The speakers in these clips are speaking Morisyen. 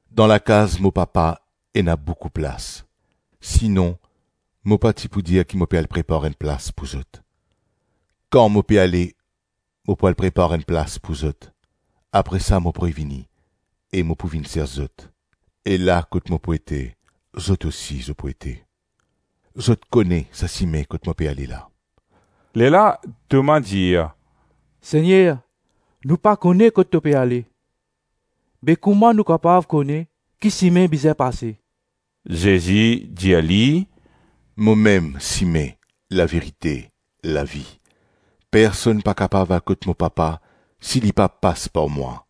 Dan lakaz mo Papa ena boukou plas, sinon mo pa ti pou dir ki mo pe al prepar enn plas pou zot? Kan mo pe ale mo pou al prepar enn plas pou zot; apre sa mo pou revini e mo pou vinn sers zot e la kot mo pou ete zot osi, zot pou ete. Zot kone sa sime kot mo pe ale la.” Lerla Toma dir, “Segner nou pa kone kot to pe ale; be kouma nou kapav kone ki sime bizin pase?” Zezi dir li, “Momem sime, laverite, lavi; personn pa kapav al kot mo Papa si li pa pas par mwa.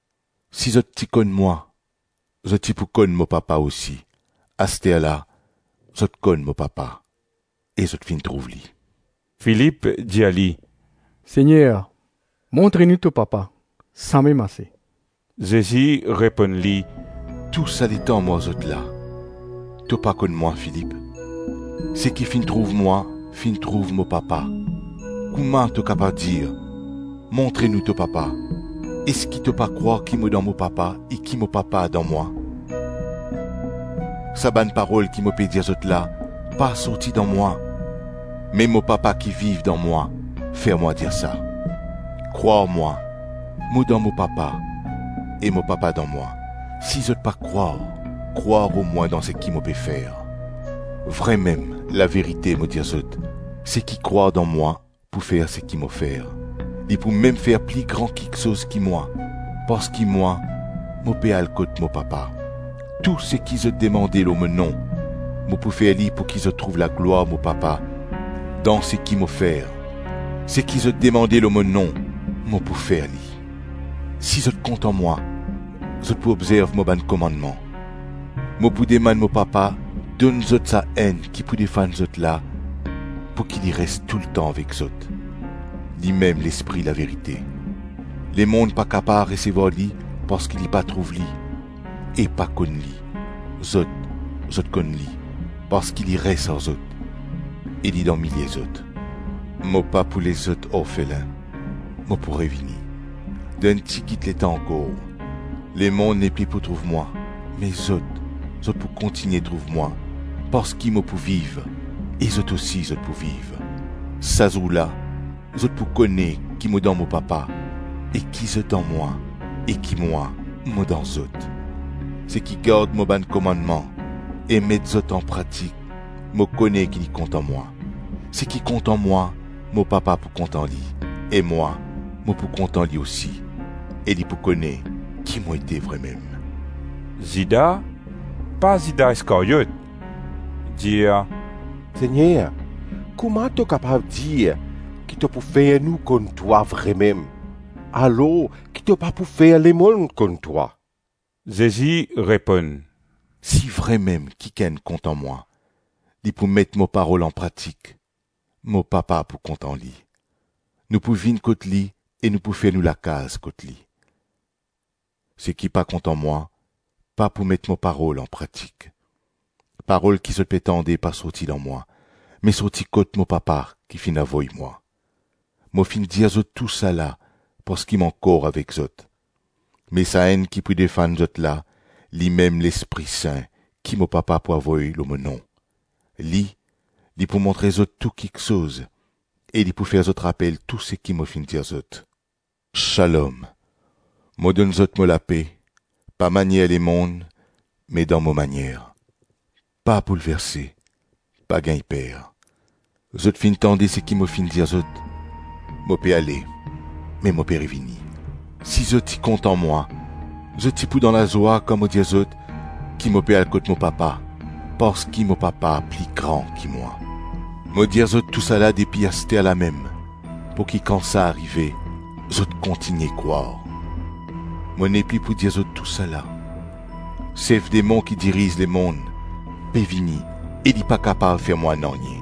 Si zot ti konn mwa, zot ti pou konn mo Papa osi. Asterla, zot konn mo Papa e zot finn trouv li.” Filip dir li, “Segner, montre nou to Papa, samem ase.” Zezi reponn li, “Tou sa letan mo ar zot la, to pa konn mwa Filip? Seki finn trouv mwa finn trouv mo Papa. Kouma to kapav dir, ‘Montre nou to Papa’? Eski to pa krwar ki mo dan mo Papa e ki mo Papa dan mwa? Sa bann parol ki mo pe dir zot la, pa sorti dan mwa me mo Papa ki viv dan mwa, fer mwa dir sa. Krwar mwa, mo dan mo Papa e mo Papa dan mwa; si zot pa krwar, krwar omwin dan seki mo pe fer. Vremem, laverite mo dir zot, seki krwar dan mwa pou fer seki mo fer; li pou mem fer pli gran kiksoz ki mwa, parski mwa mo pe al kot mo Papa. Tou seki zot demande lor mo nom, mo pou fer li pouki zot trouv laglwar mo Papa dan seki mo fer. Seki zot demande lor mo nom, mo pou fer li.” “Si zot kontan mwa, zot pou obzerv mo bann komannman. Mo pou demann mo Papa, donn zot Sa-Enn ki pou defann zot la pouki li res toultan avek zot. Limem Lespri laverite. Lemonn pa kapav resevwar li parski li pa trouv li e pa konn li. Zot, zot konn li parski li res ar zot e li dan milie zot. Mo pa pou les zot orfelin; mo pou revini. Dan enn tigit letan ankor, lemonn nepli pou trouv mwa me zot, zot pou kontigne trouv mwa parski mo pou viv e zot osi zot pou viv. Sa zour la, zot pou kone ki mo dan mo Papa e ki zot dan mwa e ki mwa, mo dan zot. Seki gard mo bann komannman e met zot anpratik, mo kone ki li kontan mwa; seki kontan mwa, mo Papa pou kontan li e mwa, mo pou kontan li osi e li pou kone ki mo ete vremem.” Zida (pa Zida Iskaryot) dir, “Segner, kouma to kapav dir ki to pou fer nou konn twa vremem alors ki to pa pou fer lemonn konn twa?” Zezi reponn, “Si vremem kikenn kontan mwa, li pou met mo parol anpratik, mo Papa pou kontan li, nou pou vinn kot li e nou pou fer nou lakaz kot li. Seki pa kontan mwa, pa pou met mo parol anpratik. Parol ki zot pe tande pa sorti dan mwa, me sorti kot mo Papa ki finn avoy mwa. Mo finn dir zot tousala parski mo ankor avek zot. Me Sa-Enn ki pou defann zot la, limem Lespri Sin ki mo Papa pou avoy lor mo nom. Li, li pou montre zot tou kiksoz e li pou fer zot rapel tou seki mo finn dir zot. Shalom, mo donn zot mo lape, pa manier lemonn me dan mo manier. Pa boulverse, pa gagn per. Zot finn tande seki mo finn dir zot, ‘Mo pe ale me mo pe revini.’ Si zot ti kontan mwa, zot ti pou dan lazwa kan mo dir zot ki mo pe al kot mo Papa, parski mo Papa pli gran ki mwa. Mo dir zot tousala depi aster lamem pouki kan sa arive, zot kontigne krwar. Mo nepli pou dir zot tousala; sef demon ki diriz lemonn pe vini e li pa kapav fer mwa nanye.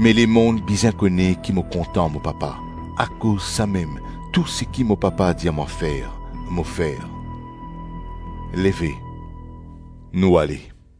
Me lemonn bizin kone ki mo kontan mo Papa, akoz samem tou seki mo Papa dir mwa fer, mo fer. Leve, nou ale.”